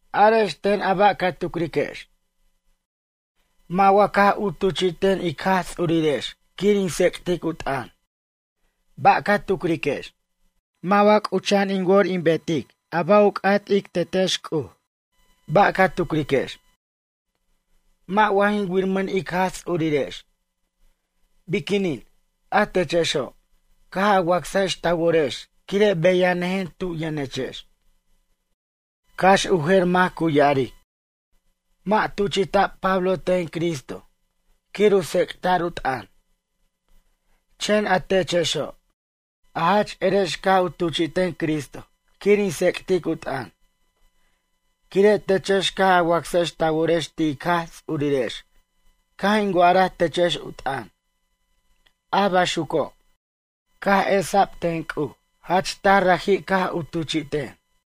Arex ten a ba' ca tucriquex. Mʌ' wa caj u tuchi'ten ic Jaj Ts'urirex quir in tsec'tic u t'ʌn, ba' ca tucriquex? Mʌ' wa c'ucha'an in wor in bet a ba' u c'at ic Tetex C'uj, ba' ca tucriquex? Mʌ' wa jin wiramʌn ic Jaj Ts'urirex? Biquinin, a techexo', caj a wacsajex ta worex quire' beyanʌjen tu' yʌnechex. Cax u jer mac cu ya'aric: “Mʌ' tuchi'ta'b Pablo ten Cristo quir u tsec'ta'r u t'ʌn.” Chen a techexo', a jach erex caj u tuchi'ten Cristo quir in tsec'tic u t'ʌn, quire' techex caj a wacsex ta worex ti' ic Jaj Ts'urirex caj in wa'araj techex u t'ʌn. A baxuco', caj esa'b ten C'uj jach taj raji' caj u tuchi'ten.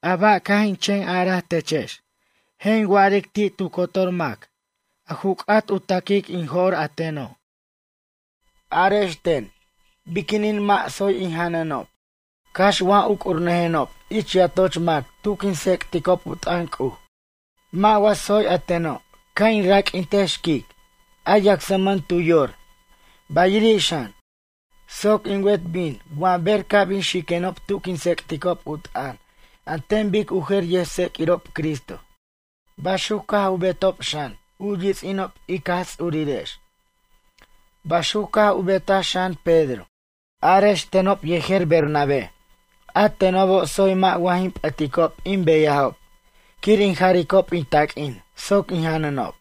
A ba' caj in chen araj techex, je' in wa'aric ti' tu cotor mac a ju c'at u ta'quic in jo'r a teno'. Arex ten, biquinin mʌ' tsoy in janʌnob, cax wa uc'urnʌjenob ich yatoch mac tu quin tsec'ticob u t'ʌn C'uj? Mʌ' wa tsoy a teno' ca' in raq'uintej xquic, a yacsmʌn tu yor, bayiri' xan, soc in wet bin wa ber ca' bin xiquenob tu quin tsec'ticob u t'ʌn an ten bic u jer yʌjtseq'uirob Cristo? Baxuc caj u betob xan u yits'inob ic Jaj Ts'urirex. Baxuc caj u betaj xan Pedro. Arex tenob yejer Bernabé, a tenobo' tsoy mʌ' wa jin p'ʌticob in beyajob quir in jaricob in taq'uin soc in janʌnob?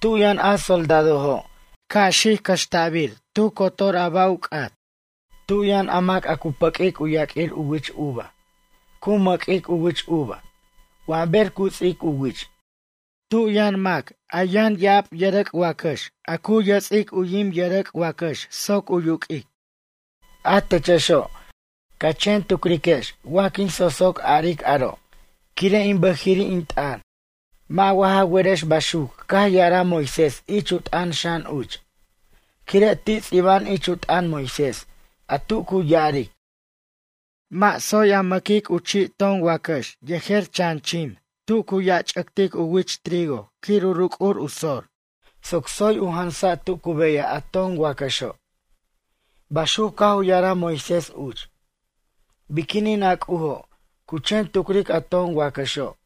Tu yʌn a soldadojo' ca' xic u cʌxta'bir tu cotor ba' u c'at? Tu yʌn a mac a cu pʌq'uic u yaq'uir u wich uva cu mʌq'uic u wich uva wa ber cu ts'ic u wich? Tu yʌn mac a yʌn yʌrʌc' wacax ya'ab a cu yʌts'ic u yim yʌrʌc' wacax soc u yuq'uic? A techexo', ca chen tucriquex wa quin so'so' a'aric aro' quire' in bʌjiri' in t'ʌn? Mʌ' wa ja werex baxuc caj ya'araj Moisés ich u t'ʌn xan uch? Quire' ti' ts'iba'an ich u t'ʌn Moisés, a tu cu ya'aric: “Mʌ' tsoy a mʌquic u chi' ton wacax yejer chan chim tu cu yarch'ʌctic u wich trigo quir u ruc'ur u sor, soc tsoy u jansan tu cu beyaj a ton wacaxo'.” Baxuc caj u ya'araj Moisés uch. Biquinin a C'ujo', cu chen tucric a ton wacaxo',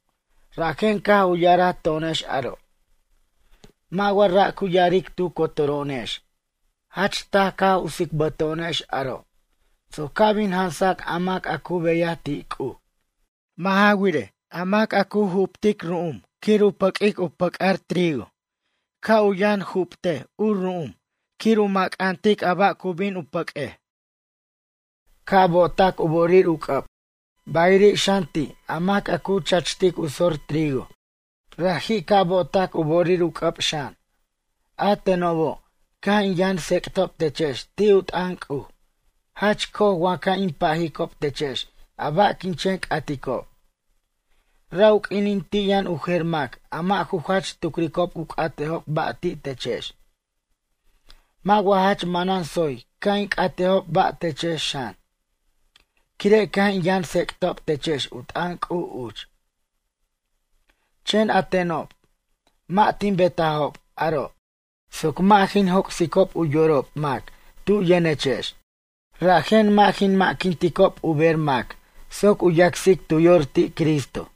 rajen caj u ya'araj to'onex aro'? Mʌ' wa ra' cu ya'aric tu cotoro'onex? Jach taj caj u ts'ibto'onex aro', soc ca' bin jansac a mac a cu beyaj ti' C'uj. Mʌ' ja wirej, a mac a cu muxic ru'um quir u pʌq'uic u pʌc'ar trigo, ca' u yʌn muxic u ru'um quir u mʌcantic a ba' cu bin u pʌq'uej. Ca' bo'otac u bo'orir u c'ʌb. Bayiri' xan ti' a mac a cu chachtic u sor trigo raji' ca' bo'otac u bo'orir u c'ʌb xan. A tenobo' caj in yʌn tsec'tob techex ti' u t'ʌn C'uj, jach co'oj wa ca' in pajicob techex a ba' quin chen c'aticob? Ra' u quinin ti' yʌn u jer mac a mʌ' ju jach tucricob u c'atejob ba' ti' techex. Mʌ' wa jach manan tsoy ca' in c'atejob ba' techex xan, quire' caj in yʌn tsec'tob techex u t'ʌn C'uj uch? Chen a tenob, mʌ' tin betajob aro', soc mʌ' jin joc'sicob u yorob mac tu yʌnechex. Rajen mʌ' jin mʌ'quinticob u ber mac soc u yacsic tu yor ti' Cristo.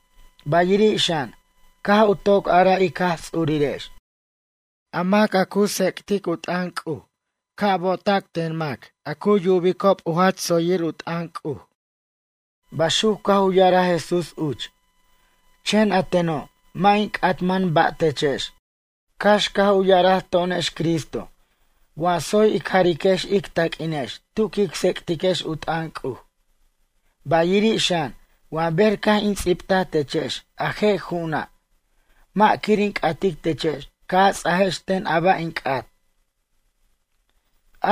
Bayiri' xan, caj u toc araj ic Jaj Ts'urirex: “A mac a cu tsec'tic u t'ʌn C'uj ca' u bo'ota' ten mac a cu yubicob u jach tsoyir u t'ʌn C'uj.” Baxuc caj u ya'araj Jesús uch. Chen a teno' mʌ' in c'atman ba' techex, cax caj u yara'aj to'onex Cristo wa tsoy ic jariquex ic taq'uinex tu quic tsec'tiquex u t'ʌn C'uj. Bayiri' xan, wa ber caj in ts'ibtaj techex a je' ju'una', mʌ' quir in c'atic techex ca' a ts'ajex ten a ba' in c'at.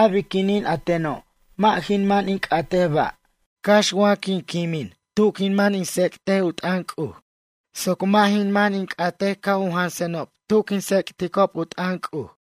A biquinin a teno' mʌ' jin man in c'atej ba', cax wa quimen tu quin man in tsec' u t'ʌn C'uj soc mʌ' jin man in c'at u jansenob tu quin tsec'ticob u t'ʌn C'uj.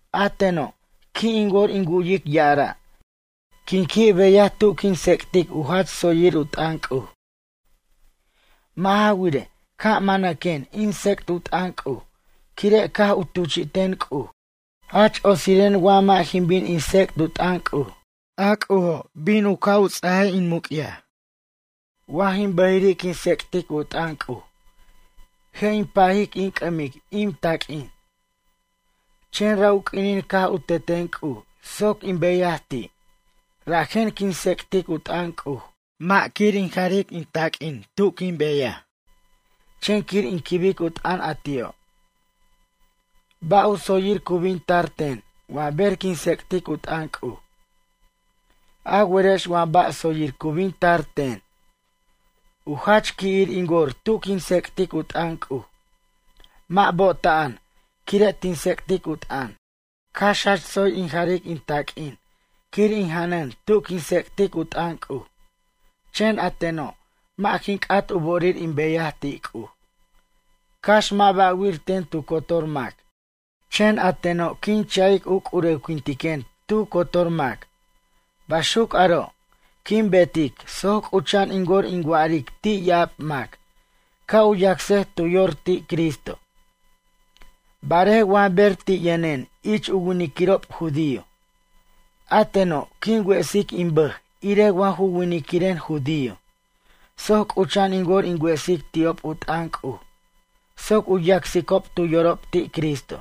A teno', qui' in wor in wu'yic ya'ara', quin qui' beyaj tu quin tsec'tic u jach tsoyir u t'ʌn C'uj. Mʌ' ja wirej, ca' manaquen in tsec't u t'ʌn C'uj, quire' caj u tuchi'ten C'uj. Jach otsiren wa mʌ' jin bin in tsec't u t'ʌn C'uj. A C'ujo', bin u ca' ts'a in muc'yaj. Wa jin bʌjiri' quin tsec'tic u t'ʌn C'uj, je' in pajic in c'ʌmic in taq'uin. Chen ra' u q'uinin caj u teten C'uj soc in beyaj ti', rajen quin tsec'tic u t'ʌn C'uj, mʌ' quir in jaric in taq'uin quin beyaj, chen quir in quibic u t'ʌn a ti'o'. Ba' u tsoyir cu bin tar ten wa ber quin tsec'tic u t'ʌn C'uj? A werex wa ba' tsoyir cu bin tar ten? U jach qui'ir in wor tu quin tsec'tic u t'ʌn C'uj, mʌ' bo'ota'an quire' tin tsec'tic u t'ʌn. Cax jach tsoy in jaric in taq'uin quir in janʌn tu quin tsec'tic u t'ʌn C'uj, chen a teno', mʌ' jin c'at u bo'orir in beyaj ti' C'uj. Cax mʌ' ba'wir ten tu cotor mac, chen a teno' quin cha'ic u c'urewquintiquen tu cotor mac. Baxuc aro', quin betic soc c'ucha'an in wor in wa'aric ti' ya'ab mac, ca' u yacsej tu yor ti' Cristo. Barej wa ber ti' yʌnen ich u winiquirob judío, a teno' quin wesic in bʌj irej wa ju winiquiren judío, soc c'ucha'an in wor in wesic ti'ob u t'ʌn C'uj soc u yacsicob tu yorob ti' Cristo.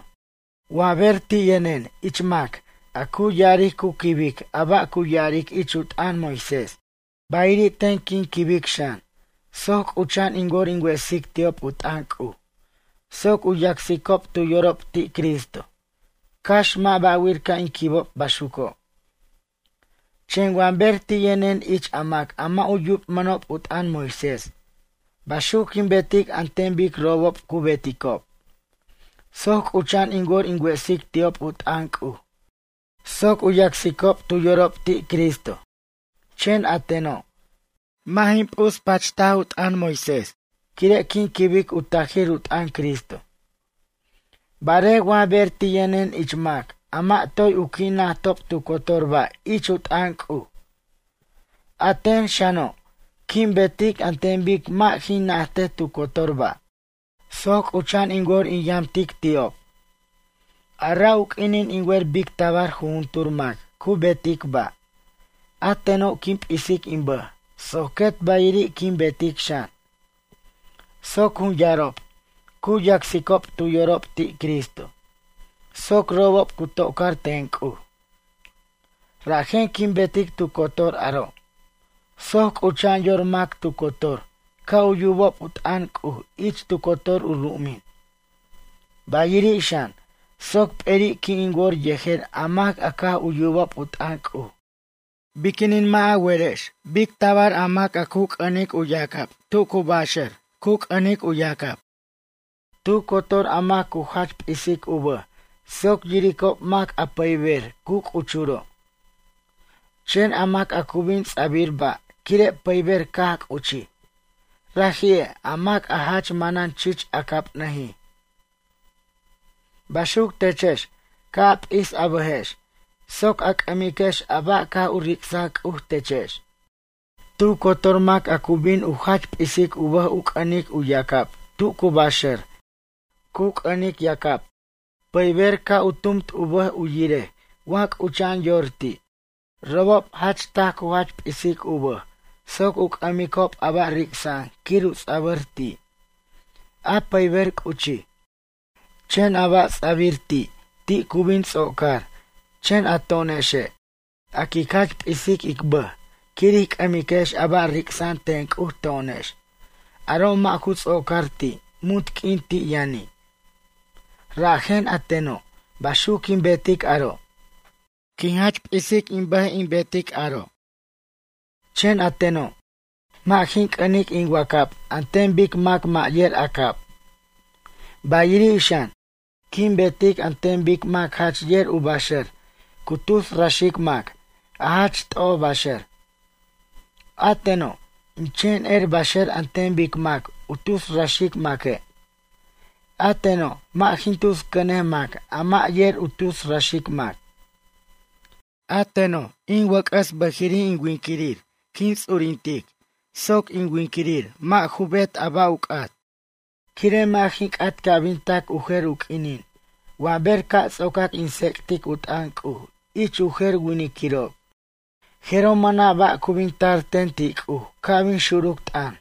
Wa ber ti' yʌnen ich mac a cu ya'aric cu quibic a ba' cu ya'aric ich u t'ʌn Moisés, bayiri' ten quin quibic xan, soc c'ucha'an in wor in wesic ti'ob u t'ʌn C'uj, soc u yacsicob tu yorob ti' Cristo, cax mʌ' ba'wir ca' in quibic baxuco'. Chen, wa ber ti' yʌnen ich a mac a mʌ' yubmʌnob u t'ʌn Moisés, baxuc quin betic an ten bic robob cu beticob, soc c'ucha'an in wor in wesic ti'ob u t'ʌn C'uj soc u yacsicob tu yorob ti' Cristo. Chen a teno', mʌ' jin p'uspacht u t'ʌn Moisés, quire' quin quibic u tajir u t'ʌn Cristo. Barej wa ber ti' yʌnen ich mac a mʌ' toy u qui' najtob tu cotor ba' ich u t'ʌn C'uj. A ten xano', quin betic an ten bic mʌ' jin najtej tu cotor ba', soc c'ucha'an in wor in yamtic ti'ob. A ra' u q'uinin in wer bic tabar jujuntur mac cu betic ba', a teno' quin p'isic in bʌj soc quet bayiri' quin betic xan, soc jun yarob cu yacsicob tu yorob ti' Cristo, soc robob cu to'car ten C'uj. Rajen quin betic tu cotor aro' soc c'ucha'an yor mac tu cotor ca' u yubob u t'ʌn C'uj ich tu cotor u ru'umin. Bayiri' xan, soc p'eri' qui' in wor yejer a mac a caj u yubob u t'ʌn C'uj. Biquinin mʌ' wa ja werex bic tabar a mac a cu c'ʌnic u yacab tu cu baxar cu c'ʌnic u yacab. Tu cotor a mac cu jach p'isic u bʌj soc yiricob mac a pʌyber cu c'uchuro'. Chen a mac a cu bin ts'abir ba' quire' pʌyber caj c'uchij, raji'e' a mac a jach manan chich acabnʌjij. Baxuc techex, ca' a p'is a bʌjex soc a c'ʌmiquex a ba' caj u ric'saj C'uj techex. Tu cotor mac a cu bin u jach p'isic u bʌj u c'ʌnic u yacab tu cu baxar cu c'ʌnic yacab, pʌyber ca' u tumt u bʌj u yirej wa c'ucha'an yor ti'. Robob jach taj cu jach p'isic u bʌj soc u c'ʌmicob a ba' ric'sa'an quir u ts'abir ti', a pʌyber c'uchij. Chen a ba' ts'abir ti', ti' cu bin ts'ocar, chen a to'onexe', a quic jach p'isic ic bʌj quir ij c'ʌmiquex a ba' ric'sa'an ten C'uj to'onex, aro' mʌ' ju ts'ocar ti', muntq'uin ti' yʌni'. Rajen, a teno', baxuc quin betic aro'. Quin jach p'isic in bʌj in bet aro'. Chen a teno', mʌ' jin c'ʌnic in wacab an ten bic mac mʌ' yer acab. Bayiri' xan, quin betic an ten bic mac jach yer u baxʌr cu tus raxic mac, a jach t'oj baxʌr. A teno', in chen er baxʌr an ten bic mac u tus raxic maque'. A teno', mʌ' jin tus cʌnej mac a mʌ' yer u tus raxic mac. A teno', in wʌc'ʌs bʌjiri' in winquirir quin ts'urintic soc in winquirir mʌ' ju bet a ba' u c'at. Quire' mʌ' jin c'at ca' bin tac u jer u q'uinin wa ber ca' ts'ocac in tsec'tic u t'ʌn C'uj ich u jer winiquirob, jeroj mʌna' ba' cu bin tar ten ti' C'uj ca' bin xuruc t'ʌn.